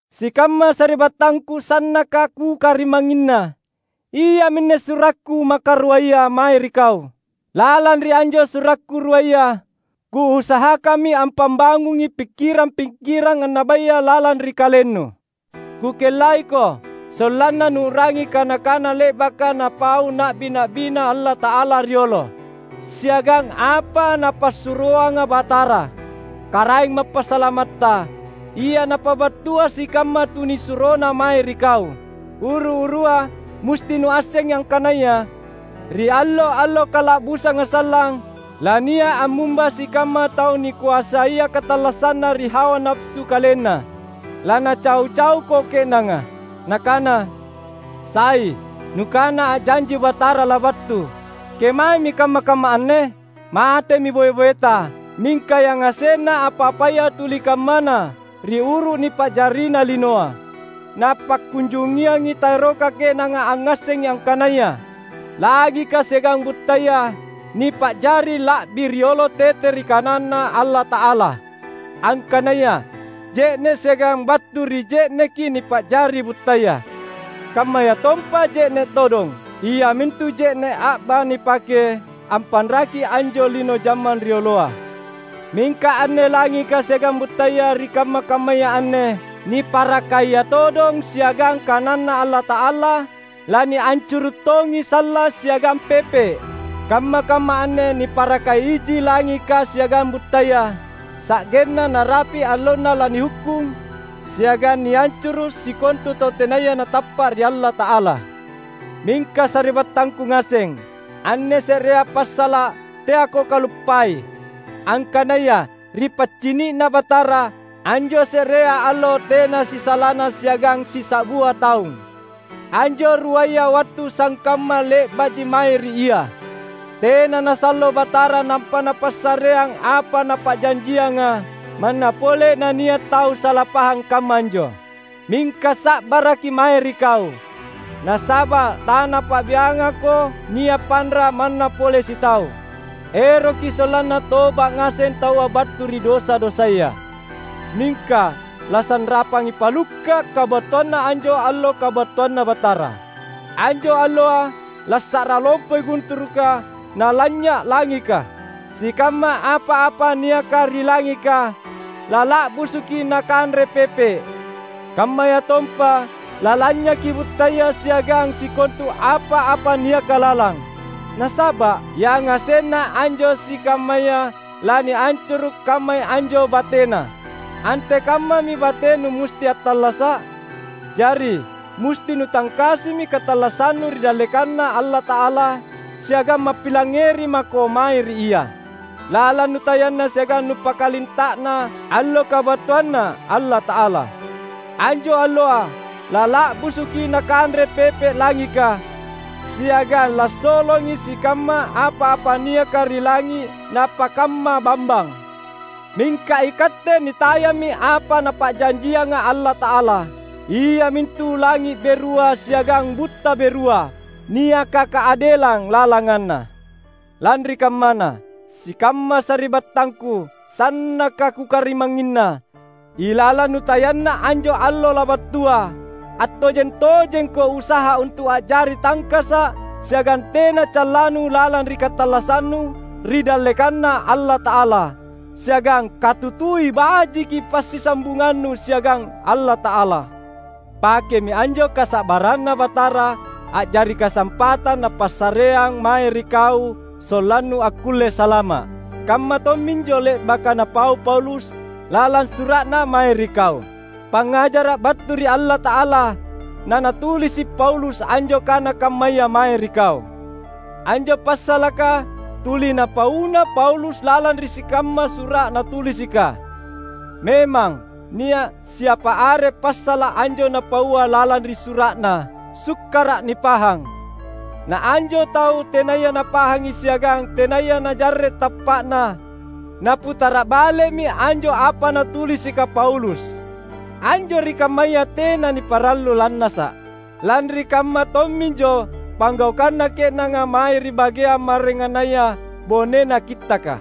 Sikamma sari’battangku sannaka kukarimangnginna! Iaminne surakku makaruaya mae ri kau. Lalang ri anjo surakku ruaya, kuusahakammi ampabangungi pikkirang-pikkirang annabaya lalang ri kalennu. Kukellaiko sollanna nuu’rangi kana-kana le’baka napau na’bi-na’biNa Allata’ala riolo, siagang apa Napassuroanga Batara, Karaeng Mappasalamatta, ia napabattua sikamma tunisuroNa mae ri kau. Uru-urua, musti nuassengi angkanaya ri allo-allo kala’busanga sallang, lania’ ammumba sikamma tau nikoasaia katallassanna ri hawa napasu kalenna. Lanacau-cauko ke’nanga, nakana, "Sai nukana a’janji Batara labattu! Kemaemi kamma-kamma anne? Matemi boe-boeta, mingka yangasenna apa-apaya tuli kammana ri uru nipa’jarina linoa!" Napakkunjungiangi taeroka ke’nanga angngassengi angkanaya langika siagang buttaya nipa’jari la’bi riolo tete ri kananNa Allata’ala; angkanaya je’ne’ siagang battu ri je’neki nipa’jari buttaya; kammayatompa je’ne’ todong, iamintu je’ne’ a’ba nipake ampanraki anjo lino jammang rioloa. Mingka anne langika siagang buttaya ri kamma-kammaya anne, niparakaia todong siagang kananNa Allata’ala, laniancuru’ tongi sallang siagang pepe’. Kamma-kamma anne niparakai iji langika siagang buttaya sa’genna narapi’ allonna lanihukkung siagang niancuru’ sikontu tau tenaya natappa’ ri Allata’ala. Mingka sari’battangku ngaseng, anne se’rea passala’ teako kaluppai: angkanaya ri paccini’Na Batara, anjo se’rea allo tena sisalana siagang sisa’bua taung. Anjo ruaya wattu sangkamma le’ba’ji mae ri Ia. Tena nasallo Batara nampa Napassareang apa Napa’janjianga, manna pole nania’ tau sala pahang kamma anjo. Mingka sa’baraki mae ri kau, nasaba’ taNapa’biangako nia’ panra’ manna pole sitau. Eroki sollanna toba’ ngaseng taua battu ri dosa-dosaya. Mingka lasanrapangi palukka’ kabattuanna anjo Allo kabattuanNa Batara. Anjo Alloa lassa’ra lompoi gunturuka nalanynya’ langika; sikamma apa-apa niaka ri langika lala’busuki nakanre pepe’. Kammayatompa lalanynyaki buttaya siagang sikontu apa-apa niaka lalang. Nasaba’ yangasenna anjo sikammaya laniancuru’ kammai anjo batena, antekammami batenu musti attallasa’? Jari musti nutangkasimi katallassannu ri dallekanNa Allata’ala, siagang mappilangngeri mako mae ri Ia, lalang nutayanna siagang nupakalinta’na Allo kabattuanNa Allata’ala. Anjo Alloa lala’busuki nakanre pepe’ langika, siagang lassolongi sikamma apa-apa niaka ri langi’ napakamma bambang. Mingka ikatte nitayammi apa Napa’janjianga Allata’ala, iamintu langi’ berua siagang butta berua, niaka kaadelang lalanganna. Lanri kammana, sikamma sari’battangku sannaka kukarimangnginna; ilalang nutayanna anjo Allo labattua, attojeng-tojengko usaha untu’ a’jari tangkasa’ siagang tena callannu lalang ri katallassannu ri dallekanNa Allata’ala. Siagang katutui bajiki passisambungannu siagang Allata’ala. Pakemi anjo kasa’barranNa Batara a’jari kasampatang Napassareang mae ri kau sollannu akkulle salama’. Kamma tomminjo le’baka napau Paulus lalang sura’na mae ri kau. Pangngajara’ battu ri Allata’ala nanatulisi’ Paulus anjo kana kammaya mae ri kau. Anjo passalaka tuli napauna Paulus lalang ri sikamma sura’ natulisika. Memang, nia’ siapa are passala’ anjo napaua lalang ri sura’na sukkara’ nipahang. Na anjo tau tenaya napahangi siagang tenaya najarre’ tappa’na, naputara’ bale’mi anjo apa natulisika Paulus. Anjo ri kammaya tena niparallu lannasa’. Lanri kamma tomminjo panggaukanna ke’nanga mae ri bageang maraengannaya bonena Kittaka.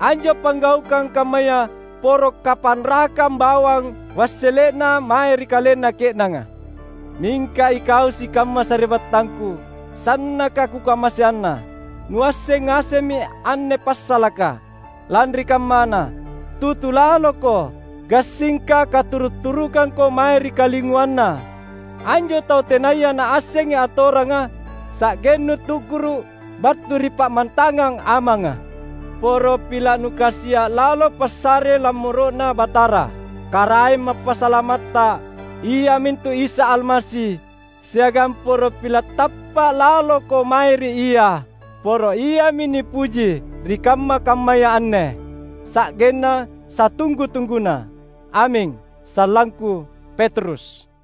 Anjo panggaukang kammaya poro kapanrakang bawang wassele’na mae ri kalenna ke’nanga. Mingka ikau sikamma sari’battangku sannaka kukamaseanna, nuasseng ngasemmi anne passalaka. Lanri kammana, tutu laloko, gassingka katuru’-turukangko mae ri kalinguanna anjo tau tenaya naassengi atoranga sa’gennu tu’guru’ battu ri pammantangang amanga. Poro pila’ nukasia’ lalo passare lammoro’Na Batara, Karaeng Mappasalamatta iamintu Isa Almasi, siagang poro pila’ tappa’ laloko mae ri Ia. Poro Iami nipuji, ri kamma-kammaya anne sa’genna satunggu-tungguna! Aming. Sallangku, Petrus